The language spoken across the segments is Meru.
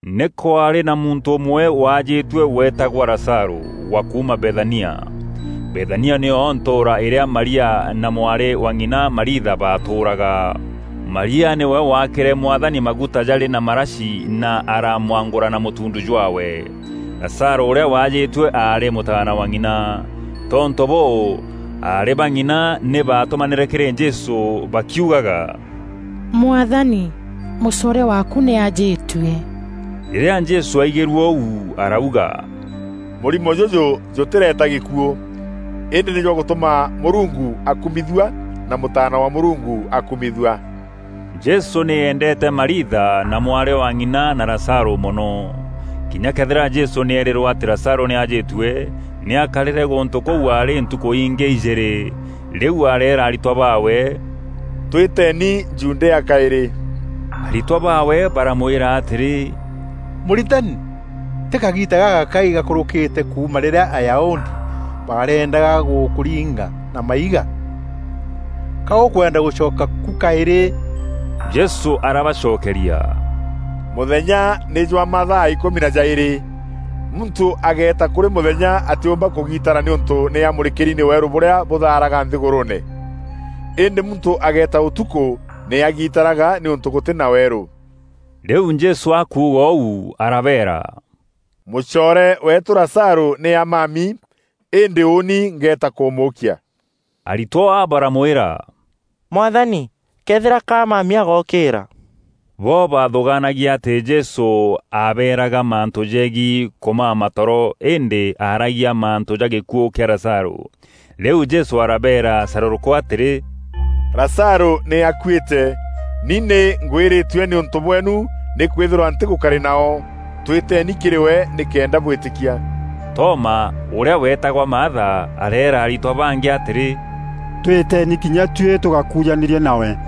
Nî kwaarî na muntû ûmwe waajîtue weetagwa Lazarû, wa kuuma Bethania. Bethania nîyo ntûûra îrîa Maria na mwarî wa ng'ina Mariitha baatûûraga. Maria nîwe waakîre Mwathani maguta jarî na marashi na aaramwangûra na mûtuundu jwaawe. Lazarû ûrîa waajîtue aarî mûtaana wa ng'ina. Tontû bûû, aarî bang'ina nî baatûmanîre kîrî Jesû bakiugaga: “Mwathani, mûcoore waaku nî ajîtue.” Rîrîa Jesû aigîrue ûu arauga, “Mûrimo jûjû jûtîreeta gîkuû, îndî nî jwa gûtûma Mûrungu akûmithua na Mûtaana wa Mûrungu akûmithua.” Jesû nî eendeete Mariitha, na mwarî wa ng'ina na Lazarû mono. Kinya këethîra Jesû nî eerîrwe atî Lazarû nî aajîtue, nî aakarîre gûntû kûu aarî ntukû ingî ijîîrî. Rîu areera aritwa baawe, “Twîteeni Judea kaîrî.” Aritwa baawe baramwîra atîrî, “Mûritani, tî kagiita gagakai gakûrûkîte kuuma rîrîa Ayahudi bareendaga gûkûringa na maiga? Ka ûkwenda gûcoka ku kaîrî?” Jesû arabacokeria, “Mûthenya nî jwa mathaa îkûmi na jaîrî. Muntû agëeta kûrî mûthenya atîûmba kûgiitara nîûntû nî amûrîkîri nî weerû bûrîa bûthaaraga nthîgûrûûne. Îndî muntû agëeta ûtukû nî agiitaraga nîûntû gûtî na weerû.” Rîu Jesû akuuga ûu arabeera, “Mûcoore weetû Lazarû nî amami, îndî ûûni ngeeta kûmûûkia.” Aritwa baramwîra, “Mwathani, këethîra ka amami agookîra.” Bo baathûgaanagia atî Jesû aabeeraga mantû jegiî kûmama toro, îndî aaragia mantû ja gîkuû kîa Lazarû. Rîu Jesû arabeera carûrûkû atîrî, “Lazarû nî akuîte. Ni nî ngwîrîtue nîûntû bweenu nîkwîthîrwa ntîgûkarî nao, twîteeni kîrî we nîkenda bwîtîkia.” Toma, ûrîa weetagwa Maatha, areera aritwa bangî atîrî, “Twîteeni kinya tuî tûgakujanîrie nawe!”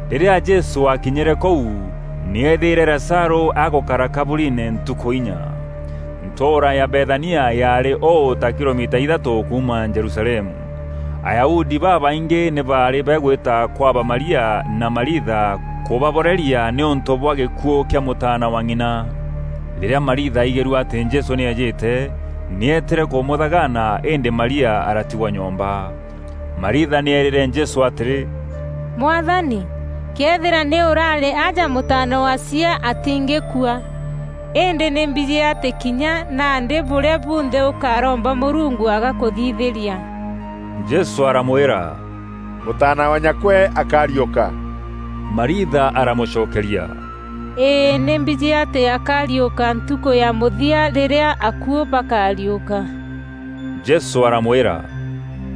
Rîrîa Jesû aakinyîre kûu, nî eethîîre Lazarû agûkara kaburiine ntukû inya. Ntûûra ya Bethania yaarî ûû ta kilomita ithaatû kuuma Jerusalemu. Ayahudi babaingî nî baarî bagwîta kwa ba Maria na Mariitha kûbaboreria nîûntû bwa gîkuû kîa mûtaana wa ng'ina. Rîrîa Mariitha aigîrue atî Jesû nî eejîte, nî eetîre kûmûthagaana îndî Maria aratigwa nyomba. Mariitha nî eerîre Jesû atîrî, “Mwathani, këethîra nî ûrarî aja mûtaana wa chiaa atîngîkua. Îndî nî mbijî atî kinya nandî bûrîa bunthe ûkaromba Mûrungu agakûthithîria.” Jesû aramwîra, “Mûtaana wa nyakwe akariûka.” Mariitha aramûcokeria, “Îî, nî mbijî atî akariûka ntukû ya mûthia rîrîa akuû bakariûka.” Jesû aramwîra,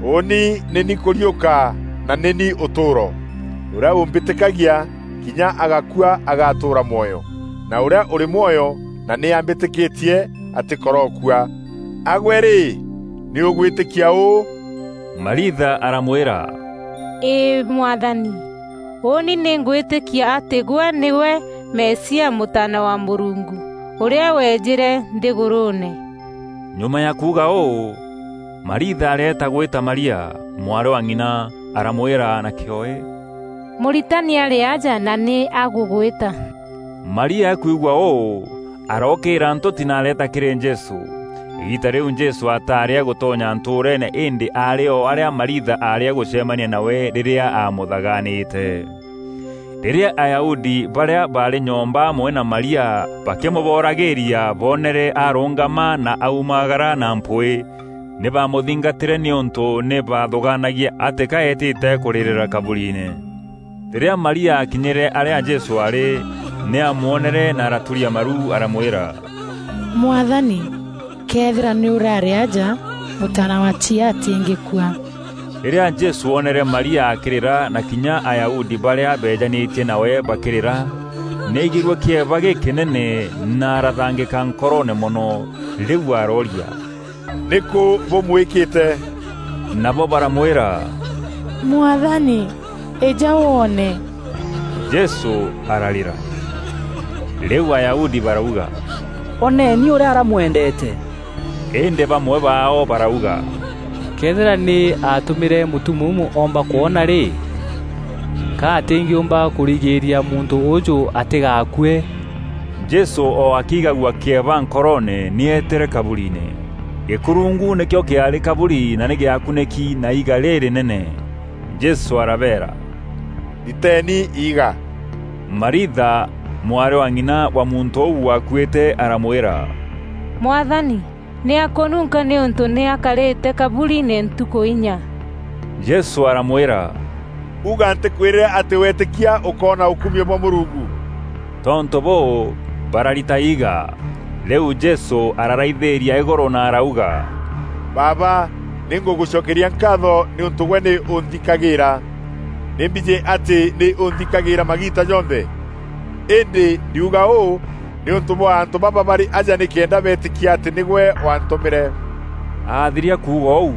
“Ûûni nî ni kûriûka na nî ni ûtûûro. Ûrîa ûmbîtîkagia, kinya agakua agatûûra mwoyo, na ûrîa ûrî mwoyo na nî ambîtîkîtie atîkorookua. A gwe rî, nî ûgwîtîkia ûû?” Mariitha aramwîra, “Îî Mwathani, ûûni nî ngwîtîkia atî gwe nîgwe Mesia, Mûtaana wa Mûrungu, ûrîa weejîre nthîgûrûûne.” Nyuma ya kuuga ûû, Mariitha areeta gwîta Maria, mwarî wa ng'ina, aramwîra na kîoe “Mûritani arî aja na nî agûgwîta.” Maria akwigua ûû, arookîîra ntûti na areeta kîrî Jesû. Îgiita rîu Jesû ataarî agûtonya ntûûreene îndî aarî o arîa Mariitha aarî agûcemania nawe rîrîa aamûthaganîte. Rîrîa Ayahudi barîa baarî nyomba amwe na Maria bakîmûboragîîria boonere arûngama na aumagara na mpwîî, nî baamûthingatîre nîûntû nî baathûgaanagia atî ka eetîte kûrîrîra kaburiine. Rîrîa Maria aakinyîre arîa Jesû aarî, nî aamwonere na araturia maru aramwîra, “Mwathani, këethîra nî ûrarî aja, mûtaana wa chiaa atîngîkua.” Rîrîa Jesû oonere Maria akîrîra na kinya Ayahudi barîa beejanîtie nawe bakîrîra, nî aaigîrue kîeba gîkînene na arathangîka nkoroone mono. Rîu arooria, “Nîkû bûmwîkîte?” Nabo baramwîra, “Mwathani, îja woone.” Jesû ararîra. Rîu Ayahudi barauga, “Oneeni ûrîa aramwendeete!” Îndî bamwe baao barauga, “Këethîra nî aatûmîre mûtumuumu oomba kwona rî, ka atîngîûmba kûrigîîria muntû ûûjû atîgaakue?” Jesû o akiigagua kîeba nkoroone nî eetîre kaburiine. Gîkurungu nîkîo kîaarî kaburi na nî gîakunîki na iiga rîrînene. Jesû arabeera, “Riteeni iiga!” Mariitha, mwarî wa ng'ina wa muntû ûû waakuîte aramwîra, “Mwathani, nî akûnunka nîûntû nî akarîte kaburiine ntukû inya.” Jesû aramwîra, “Uga ntîkwîrîre atî weetîkia ûkoona ûkumio bwa Mûrungu?” Tontû bûû, barariita iiga. Rîu Jesû araraithîîria îgûrû na arauga, “Baaba, nî ngûgûcokeria nkaatho nîûntû gwe nî ûnthikagîîra. Nî mbijî atî nî ûnthikagîîra magiita jonthe. Îndî ndiuga ûû nîûntû bwa antû baba barî aja nîkenda beetîkia atî nîgwe waantûmîre.” Athiria kuuga ûu,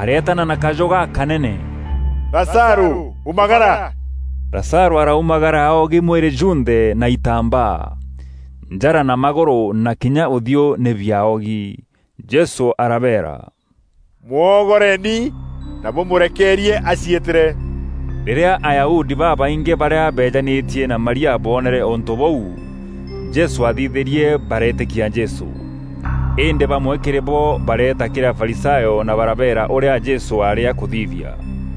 areetana na kajû gakaneene: “Lazarû, umagara!” Lazarû araumagara aogi mwîrî jûnthe na itambaa. Njara na magûrû na kinya ûthiû nî biaogi. Jesû arabeera, “Mwoogoreni, na bûmûrekeerie aciîtîre.” Rîrîa Ayahudi babaingî barîa beejanîtie na Maria boonere ûntû bûu Jesû aathithîrie bareetîkia Jesû. Îndî bamwe kîrî bo bareeta kîrî Afarisayo na barabeera ûrîa Jesû aarî akûthithia.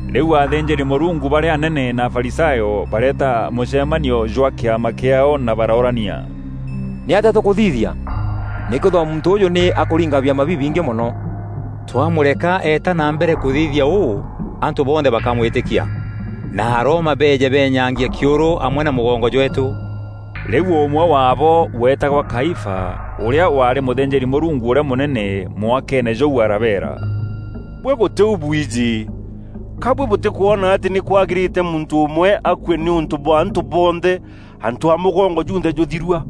Rîu athînjîri-Mûrungu barîa anene na Afarisayo, bareeta mûcemanio jwa kîama kiaao na baroorania, “Nîatîa tûkûthithia? Nîkwîthîrwa muntû ûûjû nî akûringa biama bibingî mono. Twamûreka eeta na mbere kûthithia ûû, antû bonthe bakamwîtîkia, na Aroma beeje benyaangie kîûrû amwe na mûgongo jweetû.” Rîu ûmwe waabo, weetagwa Kaifa, ûrîa waarî mûthînjîri-Mûrungu ûrîa mûnene mwakeene jûu arabeera, “Buî gûtî u bwijî. Ka buî bûtîkwona atî nî kwagîrîte muntû ûmwe akue nîûntû bwa antû bonthe, antû a mûgongo junthe jûthirua?”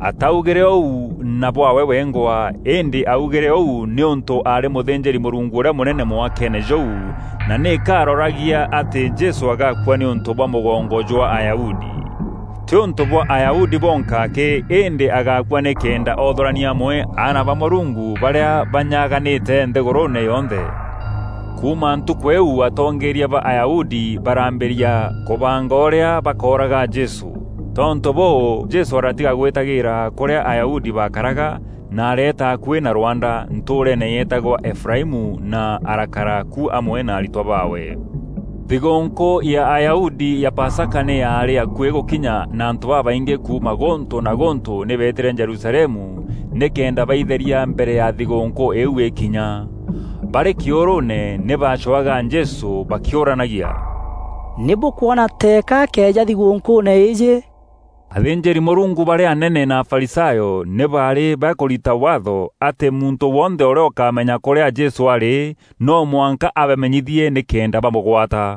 Aataugîre ûu na bwaawe wengwa, îndî aaugîre ûu nîûntû aarî mûthînjîri-Mûrungu ûrîa mûnene mwakeene jûu, na nîka aaroragia atî Jesû agakua nîûntû bwa mûgongo jwa Ayahudi. Tî ûntû bwa Ayahudi bonka akî, îndî agaakua nîkenda oothûrania amwe aana ba Mûrungu barîa banyaganîte nthîgûrûûne yonthe. Kuuma ntukû îîu atongeeria ba Ayahudi baraambîria kûbanga ûrîa bakooraga Jesû. Tontû bûû, Jesû aratiga gwîtagîîra kûrîa Ayahudi baakaraga, na areeta akuî na rwanda, ntûûreene yeetagwa Efuraimu na arakara ku amwe na aritwa baawe. Thigûûnkû ya Ayahudi ya Pasaka nî yaarî akuî gûkinya na antû babaingî kuuma gûntû na gûntû nî beetîre Jerusalemu nîkenda baitheeria mbere ya thigûûnkû îîu îkinya. Barî kîûrûûne nî baacwaga Jesû bakîûranagia, “Nî bûkwona teeka akeeja thigûnkûûne îîjî?” Athînjîri-Mûrungu barîa anene na Afarisayo nî baarî bakûrita Waatho atî muntû wonthe ûrîa ûkamenya kûrîa Jesû aarî noo mwanka abamenyithie nîkenda bamûgwata.